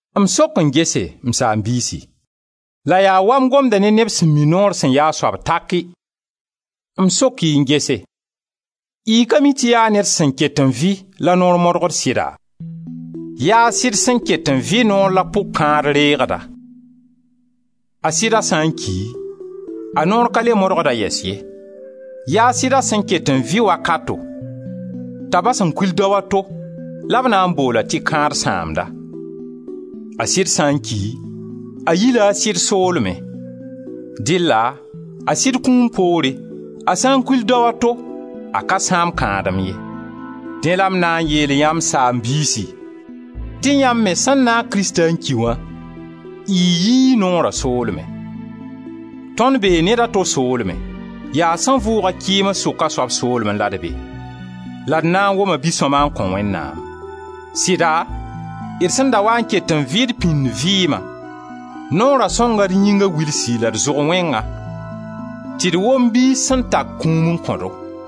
M sok n gese, m saam-biisi, la yaa waa m gomda ne neb sẽn mi noor sẽn ya a soab taki, m sok-y n gese, y ka mi tɩ yaa ned sẽn ket n vɩ la noor modgd sɩda? Yaa a sɩd sẽn ket n vɩ noor la pʋg-kãad reegda; a sɩda sã n ki, a noor ka le modgd-a yɛs ye; yaa sɩda sẽn ket n vɩ wakato t'a bas-a n kul dao a to la b na n bool-a tɩ kãad sãamda. A sɩd sã n ki, a yi-la a sɩd soolmẽ; dɩlla a sɩd kũum poore a sã n kul dao a to a ka sãamd kãadem ye. Dẽ la m na n yeelyã, m saam-biisi, tɩ yãmb me sẽn naag Krista n ki wã y yii noora soolmẽ; tõnd bee ned a to soolmẽ: yaa sẽn vʋʋg-a kɩɩms sʋka soab soolmẽ la d be, la d na n woma bi-sõma n kõ Wẽnnaam. Sɩda, d sẽn da waa n ket n vɩ d pĩnd vɩɩma, noora sõnga d yĩnga wilsi la d zʋg wẽnga tɩ d wom biis sẽn tak kũum n kõ-do.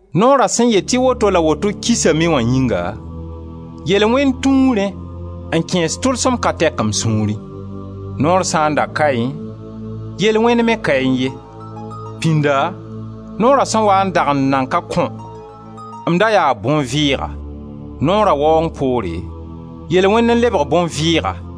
Noora sẽn yet tɩ woto la woto kisame wã yĩnga, yel-wẽnd tũu rẽ n kẽes tʋlsem ka tɛk m sũurẽ. Noor sã n da kaẽ, yel-wẽnd me kaẽ ye. Pĩnda noora sẽn waa n dag n nan ka kõ, m da yaa bõn-vɩɩga; noora waoong poore, yel-wẽnd n lebg bõn-vɩɩga,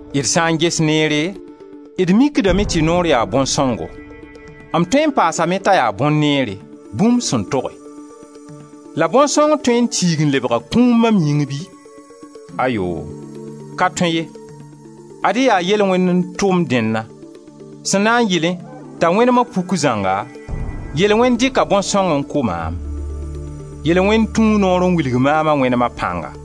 D sã n ges neere d mikdame tɩ noor yaa bõn-sõngo; m tõe n paasame t'a yaa bõn-neere, bũmb sẽn toge. La bõn-sõng tõe n tiig n lebga kũum mam yĩng bɩ? Ayoo! Ka tõe ye. Ad-y yaa yel-wẽnd n tʋm dẽnna; sẽn na n yɩlẽ t'a wẽnema puk zãnga, yel-wẽnd dɩka bõn-sõng n kʋ maam. Yel-wẽnd tũu noor n wilg maam a wẽnema pãnga.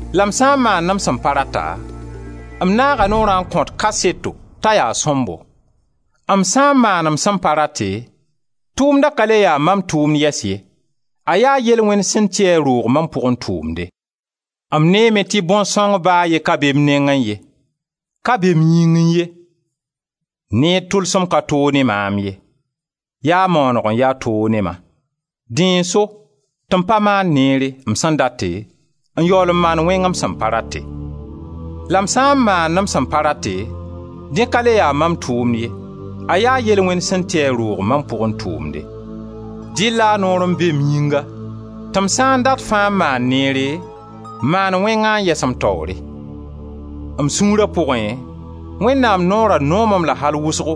La m sã n maand m sẽn pa rata, m naaga Noorã n kõt kaseto t'a yaa sõmbo. M sã n maan m sẽn pa rate, tʋʋmda ka le ya mam tʋʋmd yɛs ye, a yaa yel-wẽnd sẽn ti a roog mam pʋgẽ tʋʋmde. M neeme tɩ bõn-sõng ba a ye ka be m nengẽ ye, ka be m yĩngẽ ye; neer tʋlsem ka toog ne maam ye, yaa maaneg n ya toog ne-ma, dẽ n so tɩ m pa maand neere, m sẽn date, n yaool n maand wẽng m sẽn pa rate. La m sã n maand m sẽn pa rate, dẽ ka le ya mam tʋʋmd ye, a yaa yel-wẽnd sẽn ti a roog mam pʋgẽ tʋʋmde. Dɩlla noor n be m yĩnga tɩ m sã n dat fãa n maan neere, maan wẽngã n yɛs m taoore. M sũura pʋgẽ Wẽnnaam noora noom-m-la al wʋsgo;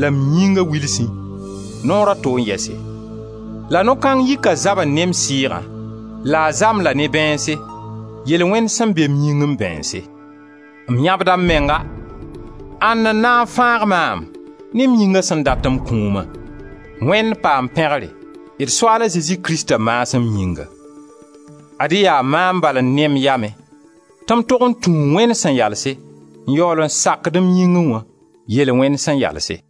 la m yĩnga wilsẽ, noora to n yɛse; la no-kãng yika zabre ne m sɩɩgã la a za-m la ne bãeense, yel-wẽnde sẽn be m yingẽ bãeense. M yãbda m menga! Ãnd n na n fãag maam ne m yĩnga sẽn dat m kũuma? Wẽnd paam pẽgr d Soaala Zezi Krista maasem yĩnga. Ad-y yaa maam bala n ne m yamẽ tɩ m tog n tũ Wẽnd sẽn yalse, n yaool n sakd m yĩngẽ wã, yel-wẽnd sẽn yalse.